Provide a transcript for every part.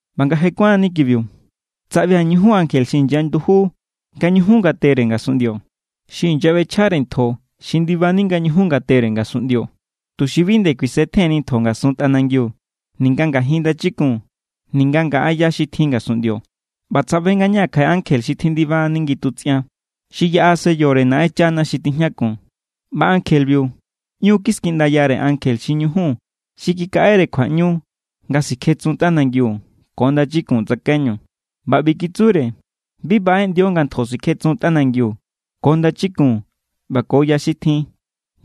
ꞌBa nga je kuánni kibiu, tsaꞌbia̱ ñujun ankje xi inyanduju nga ñujun ngatere ngasunꞌndio. Xi inyaꞌbechjare ntjo xi ndibani nga ñujun ngatere ngasunꞌndio, tuxi bi nde kuisetjenni ntjo ngasun tꞌanangiu ninga ngajin ndachikun ninga ngaꞌa ya xi tjin ngasunꞌndio. ꞌBa tsaꞌbe ngañaa̱ kjaꞌe ankje xi tjindibani ngitutsꞌian. Xi yaꞌa sellore Naꞌenchana xi tijñakun. ꞌBa ankjebiu ꞌñu kiskiꞌndayare ankje xi ñujun xi kikaꞌere kjuaꞌñu nga sikjetsun tꞌanangiu ko ndachikun tsakaiñu. ꞌBa ꞌbi kitsure: “Bi baꞌeꞌndio nga ntjo sikjetsun tꞌanangiu ko ndachikun ꞌba ko ya xi tjin,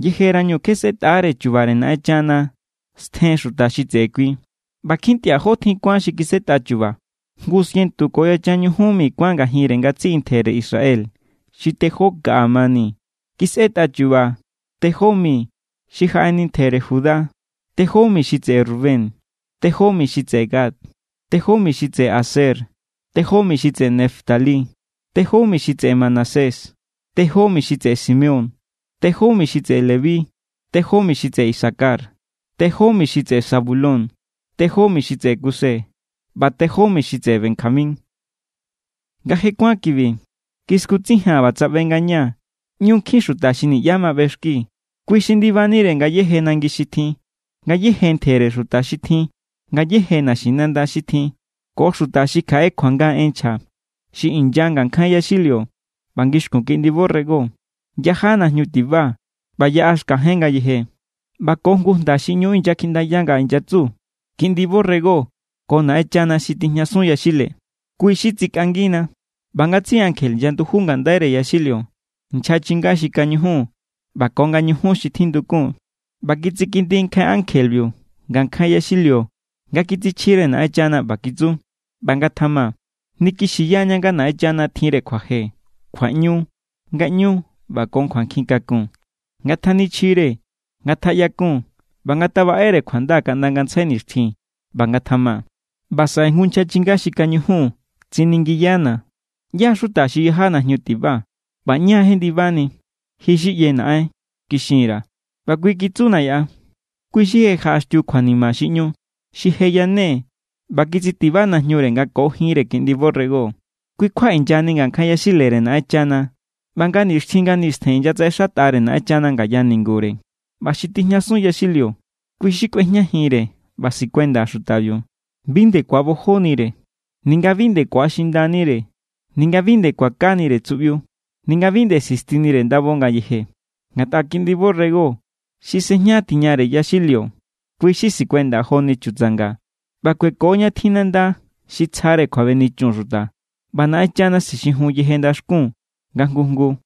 yejerañu kje sꞌetꞌaáre chu̱ba̱re Naꞌenchana stjen xuta xi tseꞌe kui.” ꞌBa kjintꞌia̱ jó tjin kuán xi kisꞌetꞌa chu̱ba̱, jngu sientu ko yachan ñujun mi kuán ngajinre ngatsiꞌi ntjere Israel xi tejó kaꞌa mani. Kisꞌetꞌa chu̱ba̱ tejó mi xi jaꞌeni ntjere Judá, tejó mi xi tseꞌe Rubén, tejó mi xi tseꞌe Gad, tejó mi xi tseꞌe Aser, tejó mi xi tseꞌe Neftalí, tejó mi xi tseꞌe Manasés, tejó mi xi tseꞌe Simeón, tejó mi xi tseꞌe Leví, tejó mi xi tseꞌe Isacar, tejó mi xi tseꞌe Zabulón, tejó mi xi tseꞌe Kuse, ꞌba tejó mi xi tseꞌe Benjamín. Nga je kuán kibi, kiskutsijia̱n ꞌba tsaꞌbe ngañaa̱ ꞌñu nkjin xuta xi niꞌyá ma ꞌbexki. Kui xi ndibanire ngayéje nangi xi tjin, ngayéje ntjere xuta xi tjin, ngayéje naxinanda xi tjin, ko xuta xi kjaꞌe kjuanga en nchja. Xi inya ngankjain yaxilio ꞌba ngixkun Kiꞌndi borrego. Yaja najñu tiba ꞌba yaꞌa xkajen ngayeje. ꞌBa ko jngu jnda xi ꞌñu inyakjiꞌndaya nga inyatsu: ¡Kiꞌndi borrego ko Naꞌenchana xi tijñasun yaxile, kui xi tsikꞌangina! ꞌBa ngatsiꞌi ankje inyanduju ngandaire yaxilio, nchja chinga xi kañujun ꞌba ko nga ñujun xi tjindukun. ꞌBa kitsikindi nkjain ankjebiu ngankjain yaxilio nga kitsichjire Naꞌenchana. ꞌBa kitsu: ¡ꞌBa ngatjama! Nikixiyaña nga Naꞌenchana tjinre kjuaje, kjuaꞌñu, ngaꞌñu ꞌba ko kjuankjin kakun. Ngatjanichjire, ngatjaꞌyakun ꞌba ngatabaꞌere kjuanda kaꞌnda ngantsjai nixtjin. ¡ꞌBa ngatjama! ꞌBa saꞌe jngu nchja chinga xi kañujun tsiningiyana̱: —¿ꞌYá= xuta xi yaja najñu tiba? ꞌBa ¿ñá= jendibani? —Ji= xi ꞌye, naꞌen —kixin_ra̱. ꞌBa kui kitsuna̱ yaꞌa: —Kui= xi je jaꞌaxtiu kjuanima xi ꞌñu. Xi je yane ꞌba kitsitiba najñure nga ko jinre Kiꞌndi borrego. Kui= kjua inyani ngankjain yaxilere Naꞌenchana ꞌba nga nixtjin nga nistjen inyatsaꞌexatꞌare Naꞌenchana ngaya ningure. ꞌBa xi tijñasun yaxilio, kui= xi kꞌuejñajinre ꞌba sikuenda xutabiu. Bi nde ku̱abojonire, ninga bi nde ku̱axindanire, ninga bi nde kuakanire tsuꞌbiu, ninga bi nde sistinire ndabo ngayeje. Ngatꞌa Kiꞌndi borrego xi sejña tiñare yaxilio, kui= xi sikuenda joni chutsanga ꞌba kueko ña tjin nanda xi tsjare kjuabenichun xuta. ꞌBa Naꞌenchana sixijun yeje ndaxkun nga jngu jngu.